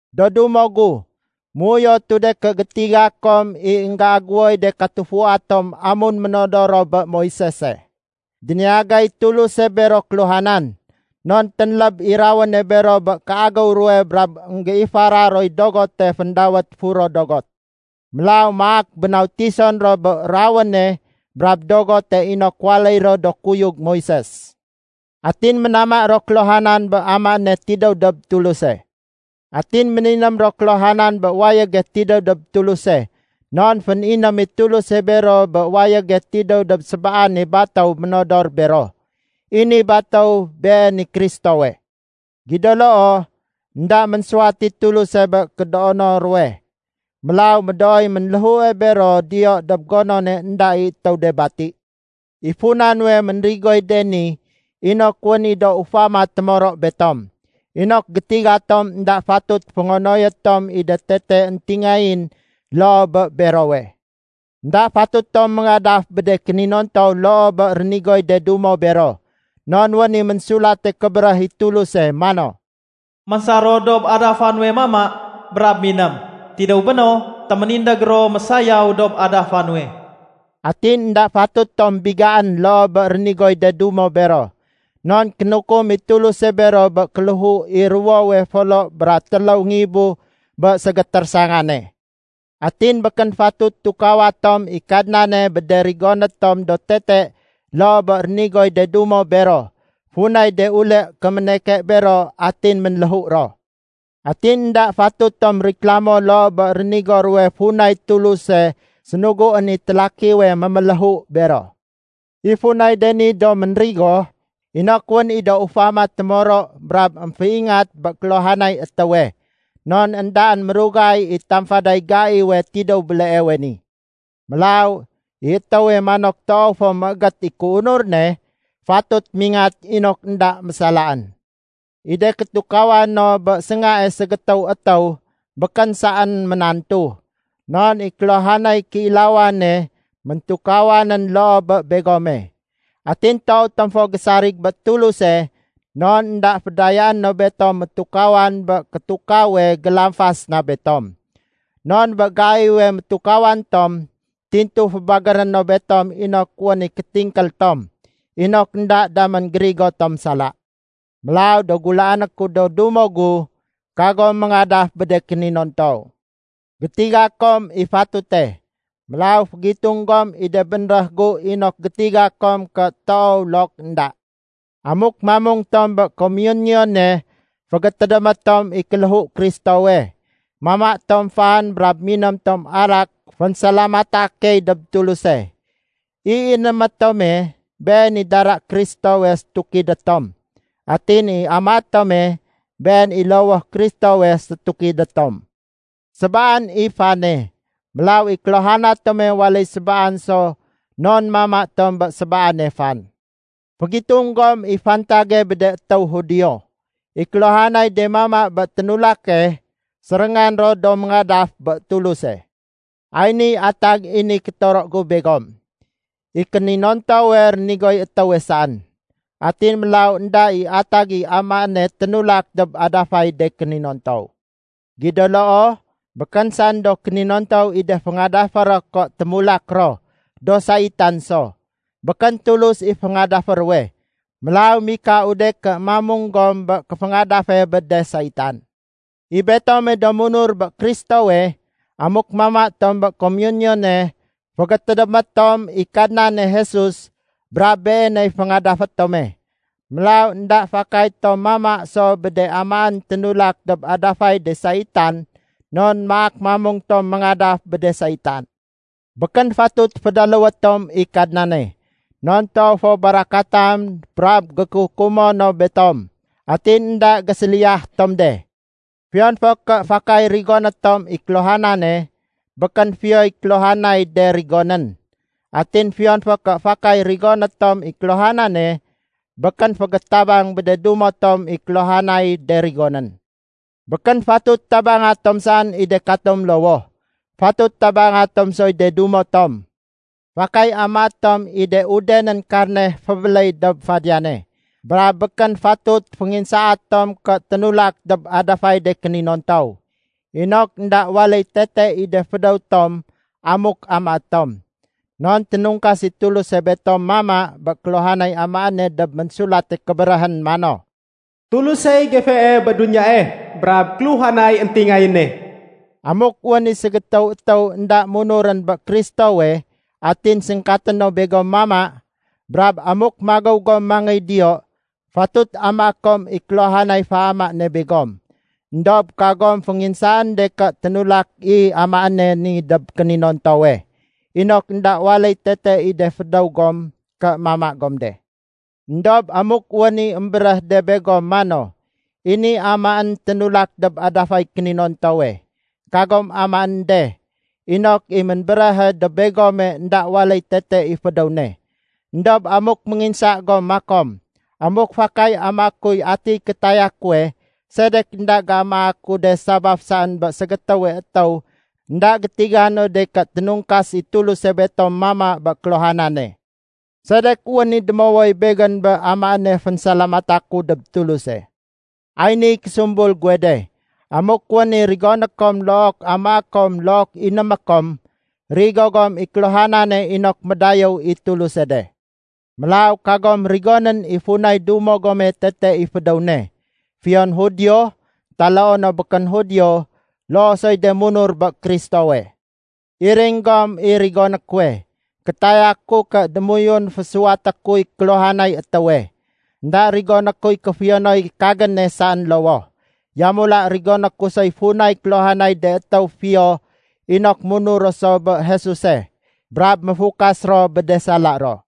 Do dumo gu, méuyotu de ké gétiga kom i énggéagéwoy de katufua tom amun ménodor ro bé Moisese. Déniyagay Tuluse bero kéluhanan. Non ténléb i rawéne bero bé kéagéw ruwe brab énggéifara roy dogote féndawét Furo Dogot. Mélaw maak bénautison ro bé rawéne brab dogote inok waléy ro do kuyug Moises. Atin ménama ro kéluhanan bé amaéne tidéw dob Tuluse. Atin méniném ro kéluhanan bé wayége tidéw dob Tuluse, non féniném i Tuluse bero bé wayége tidéw dob sébaane batéw ménodor bero. I ni batéw been i Kristowe. Gido loo, énda ménsuwat i Tuluse bé kédoono ruwe. Mélaw médooy ménléhue bero diyo dob gonone énda i étéw de bati. I funa nuwe ménrigoy de ni inok wén i do ufama témoro betom, inok gétiga tom énda fatut féngonoyé tom i de tete éntingayén loo bé berowe. Enda fatut tom méngadaf bé de kéninontow loo bé rénigoy de dumo bero. Non wén i Ménsulate Kébéréh i Tuluse mano, “Ménsar ro dob adafa nuwe mama brab miném. Tidéw béno, téménindég ro mésayaw dob adafa nuwe.” Atin énda fatut tom bigaén loo bé rénigoy de dumo bero, non kénukum i Tuluse bero bé kéléhu i ruwowe folo bra téléw ngibu bé ségétérésangane. Atin békén fatut tukawa tom i Kadnane bé de rigoné tom do tete loo bé rénigoy de dumo bero, funay de ulé kéméneke bero atin ménléhu ro. Atin énda fatut tom riklamo loo bé rénigo ruwe funay Tuluse sénuguén i télakiwe méméléhu bero. I funay de ni do ménrigo inok wén i do ufama témoro brab émféingat bé kéluhanay étéwe, non éndaén mérugay i tamfaday gaiwe tidéw béleewe ni. Mélaw, i étéwe manok toow fo méégét i kéunur ne, fatut mingat inok énda mésalaén. I de kétukawa no bé séngae ségétéw étéw békén saén ménantu, non i kéluhanay kéilawane méntukawanén loo bé begome. Atin toow tom fo gésarig bé Tuluse non énda fédayaé no betom métukawan bé kétukawe gélamfas na betom. Non bé gaiwe métukawan tom, tintu fébagéré no betom inok wén i kétingkél tom, inok énda damén gérigo tom sala. Mélaw do gulaané ku do dumo gu, kagom méngadaf bé de kéninontow. Gétiga kom i fatute, mélaw fégitung gom i de bénréh gu inok gétiga kom ké toow look énda. Amuk mamung tom bé “komiyuniyune” fégétédémé tom i kéléhu Kristowe, mama tom fan brab miném tom arak fénsalamata key dob Tuluse. I inémé tome, been i dara Kristowe sétukidé tom. Atin i amaé tome, been i lowoh Kristowe sétukidé tom. Sébaan i fane. Mélaw i kéluhana tome waléy sébaan so non mama tom bé sébaane fan. Fégitung gom i fantage bé de étéw Judio. I kéluhanay de mama bé ténulake, séréngan ro do méngadaf bé Tuluse. Ay niy atag i ni kétoro gu begom. I kéninontowe, rénigoy étéwe saén. Atin mélaw énda i atag i amaéne ténulak dob adafay de kéninontow. Gido loo, békén saén do kéninontow i de féngadafé ro, ké témulak ro do saitan so. Békén Tulus i féngadafé ruwe. Mélaw mikau de ké mamung gom bé kéféngadafe bé de saitan. I betome do munur bé Kristowe, amuk mama tom bé komiyuniyone, fégétédémé tom i Kadnane Jesus brab Beeney féngadafé tome. Mélaw énda fakay tom mama so bé de amaén ténulak dob adafay de saitan non maak mamung tom méngadaf bé de saitan. Békén fatut fédaléwé tom i Kadnane. Non toow fo barakatan brab gékukumo no betom, atin énda géséliyah tom de. Fiyon fo ké fakay rigoné tom i kéluhanane békén fiyoy kéluhanay de rigonén. Atin fiyon fo ké fakay rigoné tom i kéluhanane, békén fégétabang bé de dumo tom i kéluhanay de rigonén. Békén fatut tabanga tom saén i de katom lowoh. Fatut tabanga tom soy de dumo tom. Fakay amaé tom i de udenén karne fébéléy dob fadiyane, brab békén fatut fénginsaé tom ké ténulak dob adafay de kéninontow, inok énda waléy tete i de fédéw tom amuk amaé tom. Non ténungkas i Tuluse betom mama bé kéluhanay amaéne dob Ménsulate Kébéréhén mano, “Tulusey gefee bé duniyae brab kéluhanay éntingayéne.” Amuk wén i ségétéw étéw énda munurén bé Kristowe atin séngkaté no begom mama, brab amuk magéw gom mangéy diyo, fatut amaé kom i kéluhanay féama ne begom. Endob kagom fénginsaén de ké ténulak i amaéne ni dob kéninontowe, inok énda waléy tete i de fédéw gom ké mama gom de. Endob amuk wén i émbéréh de begom mano, “I ni amaén ténulak dob adafay kéninontowe”, kagom amaén de, inok i ménbéréhe dob begome énda waléy tete i fédéw ne. Endob amuk ménginsa gom makom, “Amuk fakay amaé kuy atiy kétaya kuwe, sedek énda géamaa ku de sabaf saén bé ségétéwe étéw énda gétiga no de ké ténungkas i Tuluse betom mama bé kéluhanane? Sedek wén i démowoy begén bé amaéne fénsalamata ku dob Tuluse?” Ay ni késumbul guwe de: Amuk wén i rigoné kom look amaé kom look inémé kom, rigo gom i kéluhanane inok médayéw i Tuluse de. Mélaw kagom rigonén i funay dumo gome tete i fédéw ne, fiyon Judio, taloo no békén Judio, loo soy de munur bé Kristowe. Iring gom i rigoné kuwe. Kétaya ku ké démoyun fésuwaté kuy kéluhanay étéwe. Enda rigoné kuy kéfiyonoy kagéne saén lowoh, yamula rigoné ku soy funay kéluhanay de étéw fiyo inok munur ro so bé Jesuse brab méfukas ro bé de sala ro.